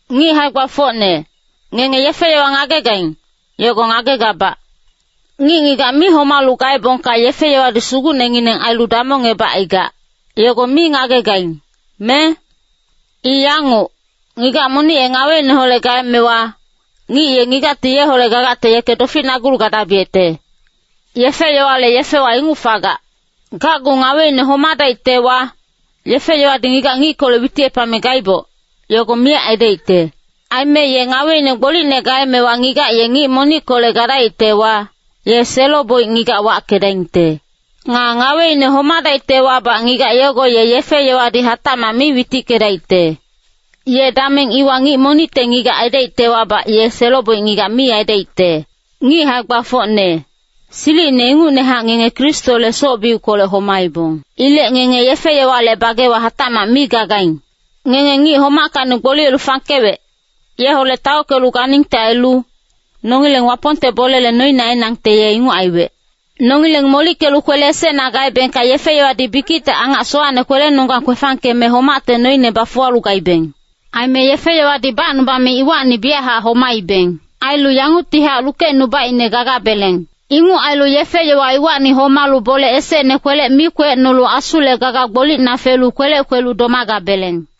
Ngic hae-gbafocne, ngenge yefe-yowa ngagegaing, yogo ngagegabac. Ngic-ngigac mi homalu gaebongka yefe-yowadi sugucnengineng ailu damongebacaigac, yogo mi ngagegaing, me? I yanguc, ngigac monic ye ngaweineholec gaemewa, ngic ye ngigacti yeholec gagacte yeke doficnagulu gadabiyecte. Yefe-yowale yefewa inguc fagac. Gacgu ngaweine homadaictewa, yefe-yowadi ngigac ngickolec witicepame gaiboc, yogo miyac aidaicte. Aime ye ngaweine gbolicne gaemewa ngigac ye ngic monickolec gadaictewa, ye selo-boic ngigac wackedaingte. Nga ngaweine homadaictewabac ngigac yogo ye yefe-yowadi hatacmac mi witickedaicte. Ye dameng iwa ngic monicte ngigac aidaictewabac ye selo-boic ngigac mi aidaicte. Ngic hae-gbafocne, silicine ingucnehac ngenge Kristole soc-biuckolec homaibong. Ilec ngenge yefe-yowale bagewa hatacmac mi gagaing. Ngenge ngic homackacni gboliyelu fangkewec, yeholec taockelu ganingte ailu, nongileng Wapongte bolele noine ainangte ye inguc aiwec. Nongileng molickelu kwele esecna gaebengka yefe-yowadi bikicte angac sowacne kwelenonggang kwefangkeme homacte noine bafuwalu gaibeng. Aime yefe-yowadi bacnubame iwacni biyachac homaibeng. Ailu yanguctihac lukecnubaicne gagabeleng. Inguc ailu yefe-yowa iwacni homalu bole esecne kwelec mi kwecnolu Asule gaga gbolicna felu kwelec kwelu domagabeleng.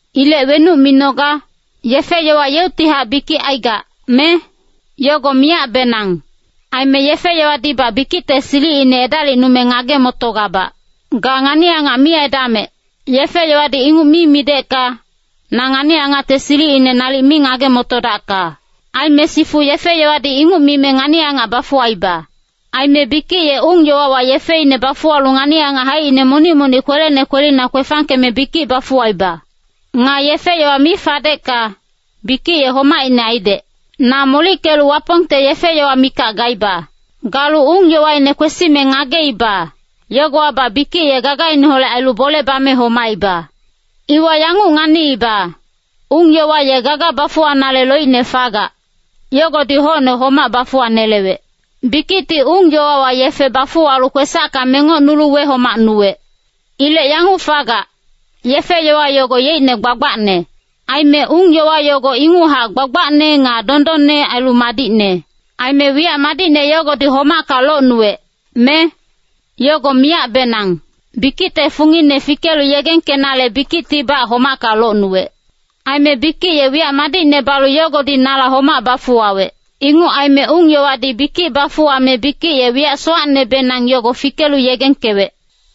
Ilec wenuc minoga? Yefe-yowa yeuctihac bikic aigac, me? Yogo miyacbenang! Aime yefe-yowadibac bikicte silicine edalicnume ngage-motogabac. “Ga ngani-angac mi aidamec.” Yefe-yowadi inguc mi midecka, na ngani-angacte silicine nalic mi ngage-motodacka. Aime sifu yefe-yowadi inguc mime ngani-angac bafuwaiba. Aime bikic ye ung-yowawa yefeine bafuwalu ngani-angac haicine monic-monic kwelene kwelina kwefangkeme bikic bafuwaiba. Nga yefe-yowa mi fadecka, bikic ye homaicne aidec. Na molickelu Wapongte yefe-yowa mikac gaiba. Galu ung-yowaine kwesime ngageiba, yogowabac bikic ye gagaineholec ailu bole bame homaiba. Iwa yanguc nganiiba, ung-yowa ye gaga bafuwanale loicne fagac, yogodi hocne homac bafuwanelewec. Bikicti ung-yowawa yefe bafuwalu kwesacka mengocnulu wehomacnuwec. Ilec yanguc fagac, yefe-yowa yogo yeicne gbagbacne. Aime ung-yowa yogo inguchac gbagbacne nga dondonne ailu madicne. Aime wiyac madicne yogodi homacka locnuwec, me? Yogo miyacbenang! Bikicte fungine fikelu yegengkenale bikictibac homacka locnuwec. Aime bikic ye wiyac madicne balu yogodi nala homac bafuwawec. Inguc aime ung-yowadi bikic bafuwame bikic ye wiyac sowacnebenang, yogo fikelu yegengkewec.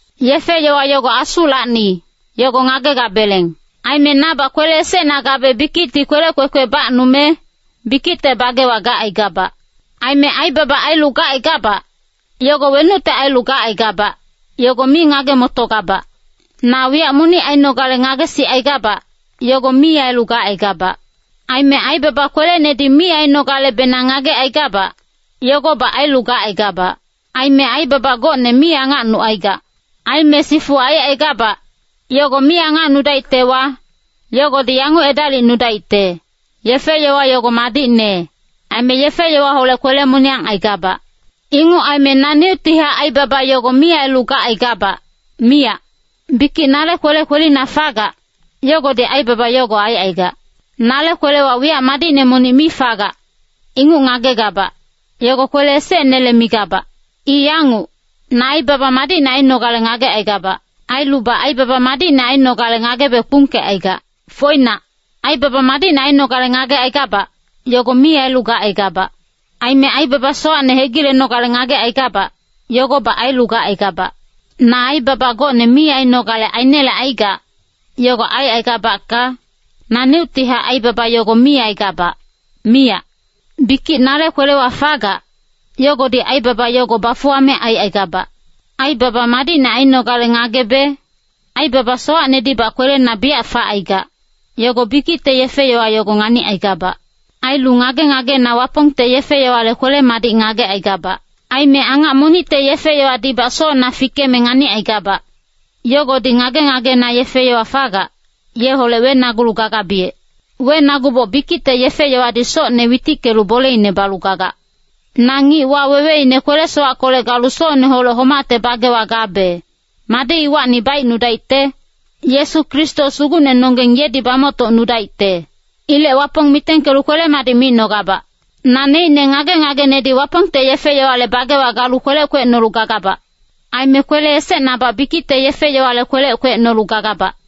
Yefe-yowa yogo Asulacni, yogo ngagegabeleng. Aime nabac kwele esecna gabe bikicti kwelec kwekwe bacnume, bikicte bagewa gacaigabac. Aime aibaba ailu gacaigabac, yogo wenucte ailu gacaigabac, yogo mi ngage-motogabac. Na wiyac monic ainogale ngagesicaigabac, yogo mi ailu gacaigabac. Aime aibaba kwelenedi mi ainogalebenang ngagecaigabac, yogobac ailu gacaigabac. Aime aibaba gocne mi angacnucaigac. Aime sifu aicaigabac, yogo mi angacnudaictewa, yogodi yanguc edalicnudaicte, yefe-yowa yogo madicne, aime yefe-yowaholec kwele-moniyang aigabac. Inguc aime naneuctihac aibaba yogo mi ailu gacaigabac, miyac. Bikic nale kwele kwelina fagac, yogodi aibaba yogo aicaigac. Nale kwelewa wiyac madicne monic mi fagac, inguc ngagegabac, yogo kwele esecnele migabac. I yanguc, na aibaba madicne ainogale ngagecaigabac. Ailubac aibaba madicne ainogale ngagebe kpungkecaigac. Foinac, aibaba madicne ainogale ngagecaigabac, yogo mi ailu gacaigabac. Aime aibaba sowacne hegilenogale ngagecaigabac, yogobac ailu gacaigabac. Na aibaba gocne mi ainogale ainelecaigac, yogo aicaigabacka, naneuctihac aibaba yogo mi aigabac, miyac. Bikic nale kwelewa fagac, yogodi aibaba yogo bafuwame aicaigabac. Aibaba madicne ainogale ngagebe, aibaba sowacnedibac kwelena biyac facaigac, yogo bikicte yefe-yowa yogo nganicaigabac. Ailu ngage-ngagena Wapongte yefe-yowale kwele-madic ngagecaigabac. Aime angac monicte yefe-yowadibac socna fikeme nganicaigabac, yogodi ngage-ngagena yefe-yowa fagac, yeholec wenagulu gagabiyec. Wenaguboc bikicte yefe-yowadi socne witickelu boleine balu gagac. Na ngic waweweine kwele-sowackolec galu socneholec homacte bagewa gabe, madi iwacni baicnudaicte? Yesu Kristo Sugucnenonggeng yedi bamoctocnudaicte. Ilec Wapong mitengkelu kwele-madic micnogabac. Naneicne ngage-ngagenedi Wapongte yefe-yowale bagewa galu kwelec kwecnolu gagabac. Aime kwele esecnabac bikicte yefe-yowale kwelec kwecnolu gagabac.